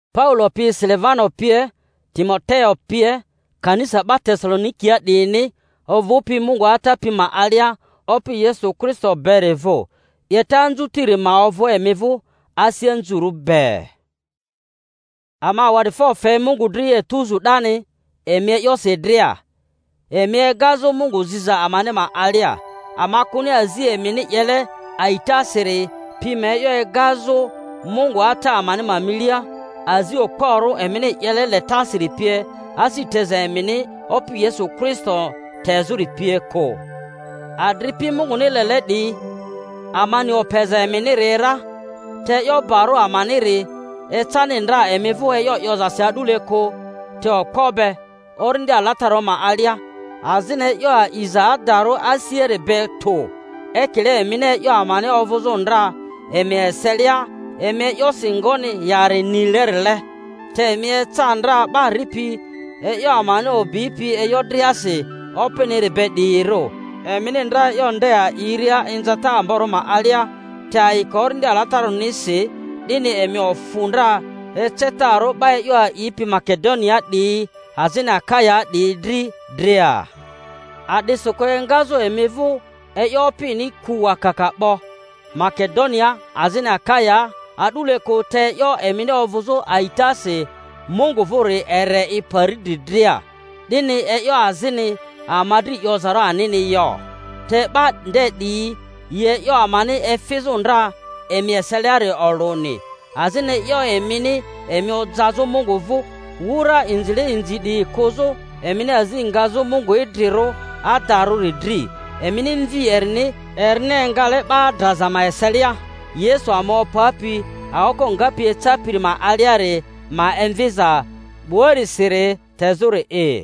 Paulo pi, Silivano pie, Timoteo pie, Kanisa 'ba Tesalonikia 'diyini, ovᴜpi Mungu Ata pi ma alia Opi Yesu Kristo beri vᴜ: 'Yeta anzutiri ma ovᴜ emi vᴜ asi anzurᴜ be. Ama awadifo fe Mungu dri etuzu 'dani emi e'yosi dria, emi egazᴜ Mungu ziza amani ma alia; ama kᴜni azi emini 'yele a itasiri. pi ma e'yo egazᴜ Mungu Ata amani ma milia, azi okporᴜ emini 'yele letasiri pie, asi teza emini Opi Yesu Kristo tezᴜri pie kᴜ. Adripi Munguni lele 'diyi, ama ni opeza eminiri ra; te e'yo barᴜ amaniri ecani ndra emi vᴜ e'yo 'yozasi a'dule kᴜ, te okpo be, Orindi Alatararᴜ ma alia, azini e'yo a'iza adarᴜ asiari be tᴜ; ekile emini e'yo amani ovᴜzᴜ ndra emi eselia emi e'yosi ngoni yari nilerile. Te emi eca ndra 'ba ripi e'yo amani o'bipi e'yo driasi Opiniri be 'diyirᴜ, emini ndra e'yo nde a'iria inzata amborᴜ ma alia, te ayiko Orindi Alatararᴜnisi; 'dini emi ofᴜ ndra ecetarᴜ 'ba e'yo a'ipi Makedoniaa 'diyi azini Akayaa 'diyi dri dria. A'disikᴜ engazᴜ emi vᴜ e'yo Opini ku wakaka 'bo, Makedo-niaa azini Akayaa a'dule kᴜ, te e'yo emini ovᴜzᴜ a'itasi Mungu vᴜri ere i pari dri dria, 'dini e'yo azini ama dri 'yozarᴜ anini yo. Te 'ba nde 'diyi yi e'yo amani efizᴜ ndra emi eseliari olᴜni, azini e'yo emini emi ojazᴜ Mungu vᴜ, wura inzile inzi 'diyi kᴜzᴜ, emini azi ngazᴜ Mungu idrirᴜ adarᴜri dri, emini Mvi erini, erini engale 'ba draza ma eselia, Yesu ama opapi aoko ngapi ecapiri ma aliari ma emviza 'buarisiri tezᴜri'i.